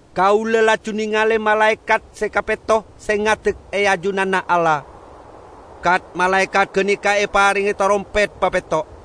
Kaula laju nengale malaekat se kapetto se ngadek e ajunanna Allah; kat-malaekat ganeka eparenge tarompet papetto'.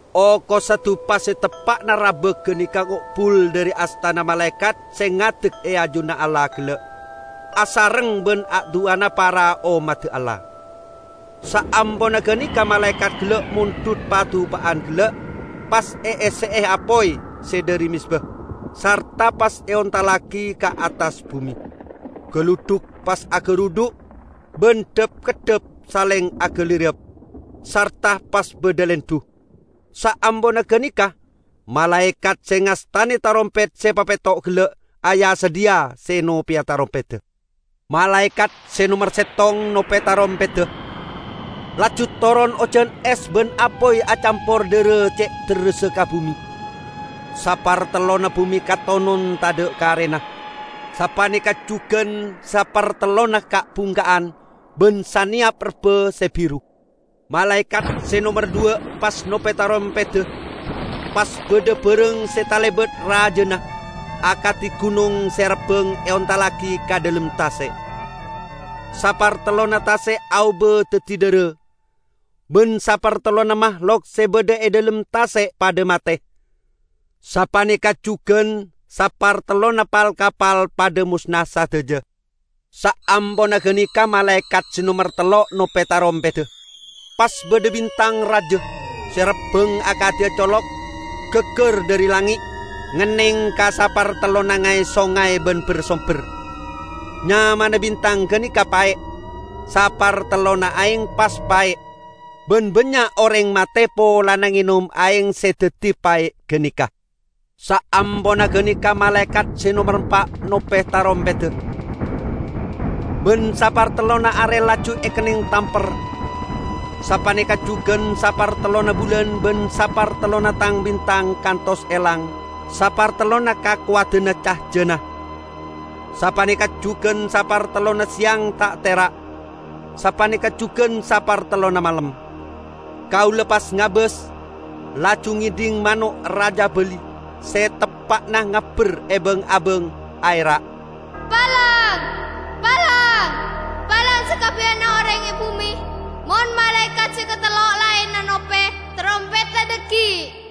Okossa dupa se teppa'na rabak ganeka ngo'bul dhari astana malaekat se ngadek e ajunanna Allah gella' asareng ban a-du'ana para ommadda Allah. Saamponna ganeka malaekat gella' mondhut padupa'an gella', pas eesse'e apoy se dhari mezba, sarta pas eontallagi ka attas bume. Galudhuk pas agarudhu' ban dhap-keddhap saleng agalirap, sarta pas badha lendhu. Saamponna ganeka, malaekat se ngastane tarompet se papetto' gella' aya-sadhiya se nopeya tarompedda. Malaekat se nomer settong nope tarompedda, laju toron ojan es ban apoy acampor dhara ce' derressa ka bume. Sapartellonna bume katonon tadha' karena; sapaneka jugan sapartellonna ka'-bungka'an, ban saneyap rebba se biru. Malaekat se nomer dhuwa' pas nope tarompedda, pas badha barang se talebat rajana, akadi gunong se rabbang eontallagi ka dhalem tase'. Sapartellonna tase' aoba daddi dhara, ban sapartellonna mahlok se badha e dhalem tase' padha mate; sapaneka jugan sapartellonna pal-kapal padha mosna sadaja. Saamponna ganeka malaekat se nomer tello' nope tarompedda, pas badha bintang raja, se rabbang akadi colok, gaggar dhari langnge', ngenneng ka sapartellonna ngay-songay ban ber-somber. (Nyamana bintang ganeka "Pae'".) Sapartellonna aeng pas pae', ban bannya' oreng mate polana ngenom aeng se daddi pae' ganeka. Saamponna ganeka malaekat se nomer empa' nope tarompedda, ban sapartellonna are laju ekenneng tamper, sapaneka jugan sapartellonna bulan ban sapartellonna tang-bintang kantos elang sapartellonna kakowadanna cajana. Sapaneka jugan sapartellonna seyang ta' tera', sapaneka jugan sapartellonna malem. Kaula pas ngabas, laju ngedhing mano' rajabali se teppa'na ngabberebang-abang, aera', "Palang! Palang! Palang sakabbiyanna oreng e bume mon malaekat se katello laenna nope tarompedda dhaggi'!"